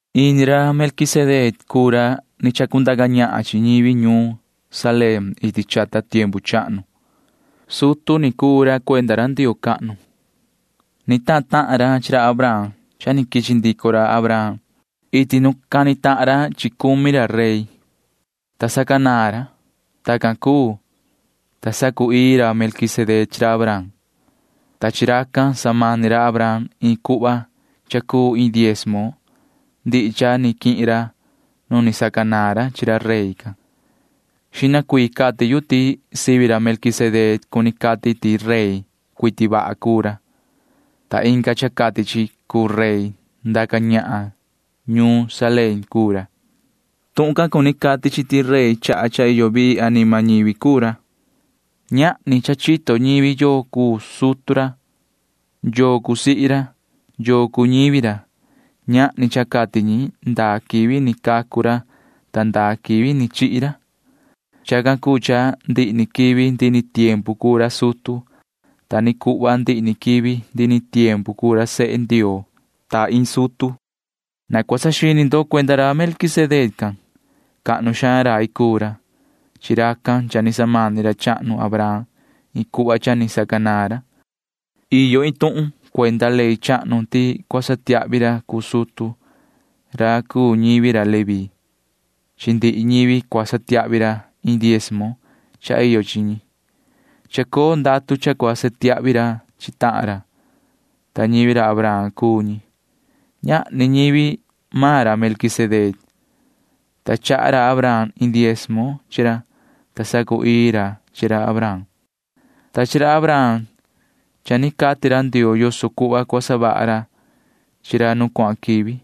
Ini ra Melquisedec cuu ra ni chacundaca ñahan chi ñivi ñuun Salem iti chata tiempu chahnu. Sutu ni cuu ra cuenda ra Ndioo cahnu. Ni tahan tahan ra chi ra Abraham cha ni quichi ndico ra Abraham iti nu ni cani tahan ra chi cumi ra rey, ta sacanaan ra. Tacan cuu, ta sacu‑ii ra Melquisedec chi ra Abraham, ta chi racan samani ra Abraham iin cuhva cha cuu iin diezmo ndihi cha ni quihin ra nu ni sacanaan ra chi ra rey can. Xihna cuii cati yu ti sivi ra Melquisedec cuni cati ti rey cuiti vaha cuu ra, ta inga cha cati chi cuu rey ndaca ñahan ñuun Salem cuu ra. Tuhun can cuni cati chi ti rey chaha cha iyo vii anima ñivi cuu ra. Ñahni cha chito ñivi yoo cuu sutu ra, yoo cuu sihi ra, yoo cuu ñivi ra. Ñahni cha cati ñi ndaa quivi ni cacu ra ta ndaa quivi ni chihi ra. Chacan cuu cha ndihi ni quivi ndihi ni tiempu cuu ra sutu. Ta ni cuhva ndihi ni quivi ndihi ni tiempu cuu ra sehe Ndioo ta iin sutu. Na cua saxini ndo cuenda ra Melquisedec can. Cahnu xaan rai cuu ra. Chi racan cha ni samani ra chahnu Abraham iin cuhva cha ni sacanaan ra. Iyo iin tuhun cuenda ley chahnu ti cua satiahvi ra cuu sutu―ra cuu ñivi ra Leví. Chi ndihi ñivi cua satiahvi ra iin diezmo cha iyo chi ñi. Chacoo ndatu cha cua satiahvi ra chi tahan ra, ta ñivi ra Abraham cuu ñi. Ñahni ñivi maan ra Melquisedec, ta chaha ra Abraham iin diezmo chi ra, ta sacu‑ii ra chi ra Abraham, ta chi ra Abraham cha ni cati ra Ndioo yoso cuhva cua savaha ra chi ra nu cuahan quivi.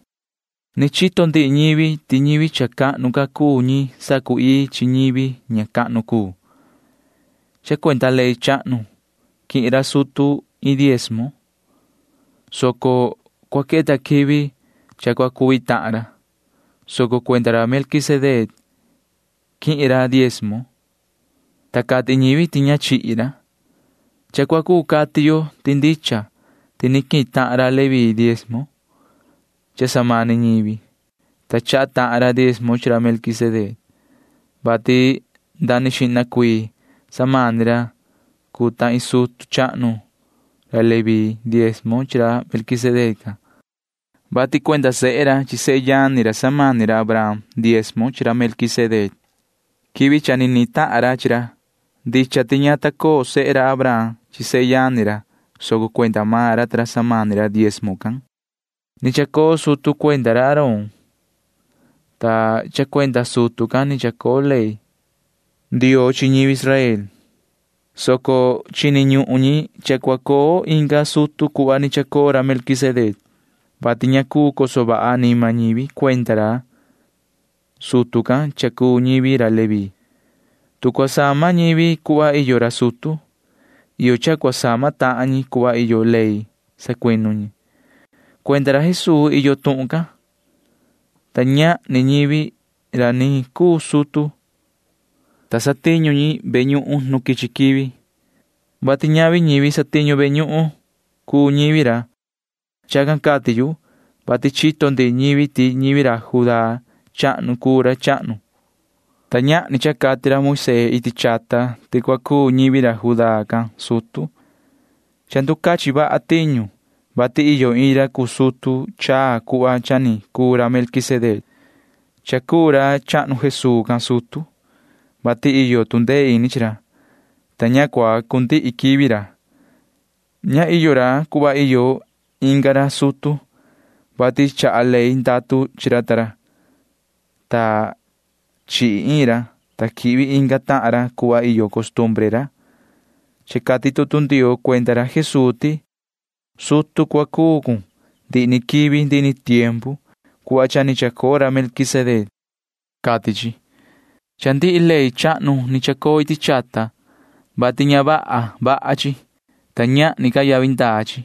Ni chito ndihi ñivi ti ñivi cha cahnu ca cuu ñi sacu‑ii chi ñivi ña cahnu cuu. Cha cuenda ley chahnu quihin ra sutu iin diezmo, soco cua queta quivi cha cua cuvi tahan ra, soco cuenda ra Melquisedec quihin ra diezmo, ta cati ñivi ti ña chihi ra. Cha cua cuu cati yo ti ndicha ti ni quihin tahan ra Leví deizmo cha samani ñivi, ta chaha tahan ra diezmo chi ra Melquisedec, vati nda ni xihna cuii samani ra cuu ta iin sutu chahnu ra Leví diezmo chi ra Melquisedec can, vati cuenda sehe ra chi sehe yani ra samani ra Abraham diezmo chi ra Melquisedec quivi cha ni nihin tahan ra chi ra. Ndicha ti ña ta coo sehe Abraham chi sehe yani ra, soco cuenda maan ra ta ra samani ra diezmo can. Ni chacoo sutu cuenda ra Aarón, ta cha cuenda sutu can ni chacoo ley Ndioo chi ñivi Israel, soco chini ñuhun ñi cha cua coo inga sutu cuhva ni chacoo ra Melquisedec, vati ña cuu coso vaha anima ñivi cuenda ra sutu can cha cuu ñivi ra Leví. Tu cua sama ñivi cuhva iyo ra sutu, iyo cha cua sama tahan ñi cuhva iyo ley sacuinu ñi. Cuenda ra Jesuu iyo tuhun can, ta ñahni ñivi ra ni cuu sutu, ta satiñu ñi ve ñuhun nu ni quichi quivi, vati ñavi ñivi satiñu ve ñuhun cuu ñivi ra. Chacan cati yu, vati chito ndihi ñivi ti ñivi ra Judá chahnu cuu ra chahnu, ta ñahni cha cati ra Moisee iti chata ti cua cuu ñivi ra Judá can sutu. Cha nducachin vaha tiñu, vati iyo iin ra cuu sutu chaa cuhva cha ni cuu ra Melquisedec. Cha cuu ra chahnu Jesuu can sutu, vati iyo tu ndee ini chi ra, ta ña cua cundihi quivi ra. Ña iyo ra cuhva iyo inga ra sutu, vati chaha ley ndatu chi ra ta ra, ta chihi iin ra, ta quihvi inga tahan ra cuhva iyo costumbre ra. Cha cati tutu Ndioo cuenda ra Jesuu ti: Sutu cua cuu cun ndihi ni quivi ndihi ni tiempu cuhva cha ni chacoo ra Melquisedec, cati chi. Cha ndihi ley chahnu ni chacoo iti chata, vati ña vaha vaha chi, ta ñahni ca yavi ndaa chi.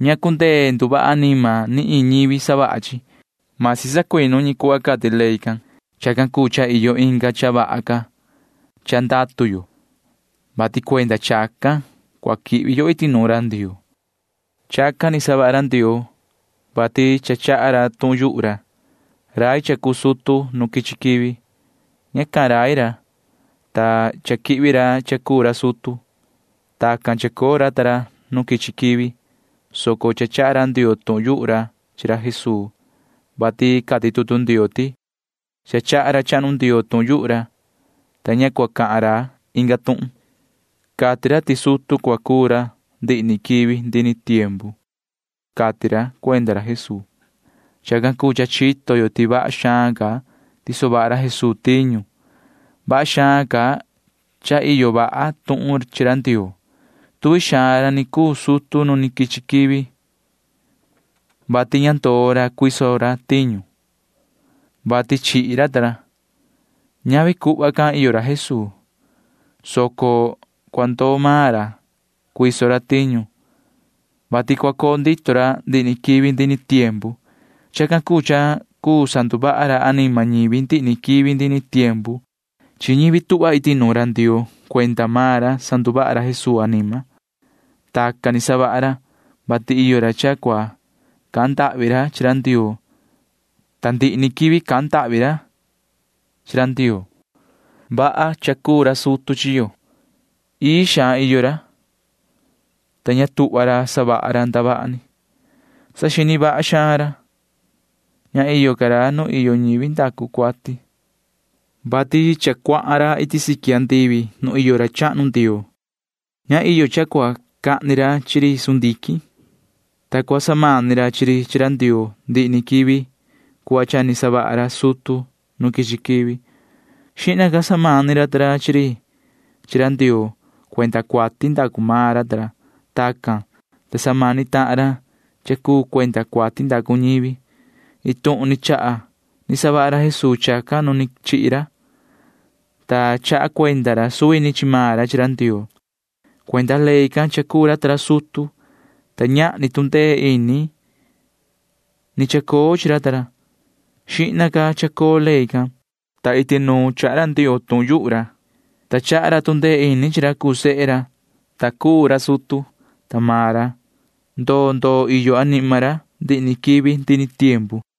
Ña cundee nduvaha anima ni iin ñivi savaha chi―masi sacuinu ñi cuhva cati ley can. Chacan cuu cha iyo inga cha vaha ca cha ndatu yo, vati cuenda chacan cua quihvi yo iti nuun ra Ndioo. Chacan ni savaha ra Ndioo, vati cha cahan ra iin cha rai. Rai cha cuu sutu nu quichi quivi―ña cahan ra iin cha rai, ta cha quihvi ra cha cuu ra sutu. Tacan chacoo ra ta ra nu quichi quivi, soco cha cahan ra Ndioo iin cha rai chi ra Jesuu can, vati cati tutu Ndioo ti: Cha cahan ra chahnu Ndioo iin cha rai, ta ña cua cahan ra inga tuhun. Cati ra ti sutu cua cuu ra ndihi ni quivi ndihi ni tiempu, cati ra cuenda ra Jesuu. Chacan cuu cha chito yo ti vaha xaan ca tiso vaha ra Jesuu tiñu. Vaha xaan ca cha iyo vaha tuhun chi ra Ndioo. Tuvi xaan ra ni cuu sutu nu ni quichi quivi, vati ña ndoo ra cuiso ra tiñu, vati chihi ra ta ra. Ñavi cuhva can iyo ra Jesuu, soco cua ndoo maan ra cuiso ra tiñu, vati cua coo ndito ra ndihi ni quivi ndihi ni tiempu. Chacan cuu cha cuu sanduvaha ra anima ñivi ndihi ni quivi ndihi ni tiempu. Chi ñivi tuhva iti nuun ra Ndioo cuenda maan ra sanduvaha ra Jesuu anima. Tacan ni savaha ra, vati iyo ra cha cua cahan ndahvi chi ra Ndioo, ta ndihi ni quivi cahan ndahvi ra chi ra Ndioo. Vaha cha cuu ra sutu chi yo. Ii xaan iyo ra, ta ña tuhva ra savaha ra ndavaha ni. Saxini vaha xaan ra. Ña iyo ca ra nu iyo ñivi ndacu cuati, vati cha cuahan ra iti siqui andivi nu iyo ra chahnu Ndioo. Ña iyo cha cua cahni ra chi ri sundiquin, ta cua samani ra chi ri chi ra Ndioo ndihi ni quivi cuhva cha ni savaha ra sutu nu quichi quivi. Xihna ca samani ra ta ra chi ri chi ra Ndioo cuenda cuati ndacu maan ra ta ra. Tacan, ta sa samani tahan ra cha cuu cuenda cuati ndacu ñivi. Iin tuhun ni chaha ni savaha ra Jesuu chacan nu ni chihi ra, ta chaha cuenda ra suvi ni chi maan ra chi ra Ndioo. Cuenda ley can cha cuu ra ta ra sutu, ta ñahni tu ndee ini ni chacoo chi ra ta ra. Xihna ca chacoo ley can, ta iti nuun quechaha cahan ra Ndioo iin cha rai, ta chaha ra tu ndee ini chi ra cuu sehe ra, ta cuu ra sutu, ta maan ra―ndoo ndoo iyo anima ra ndihi ni quivi ndihi ni tiempu.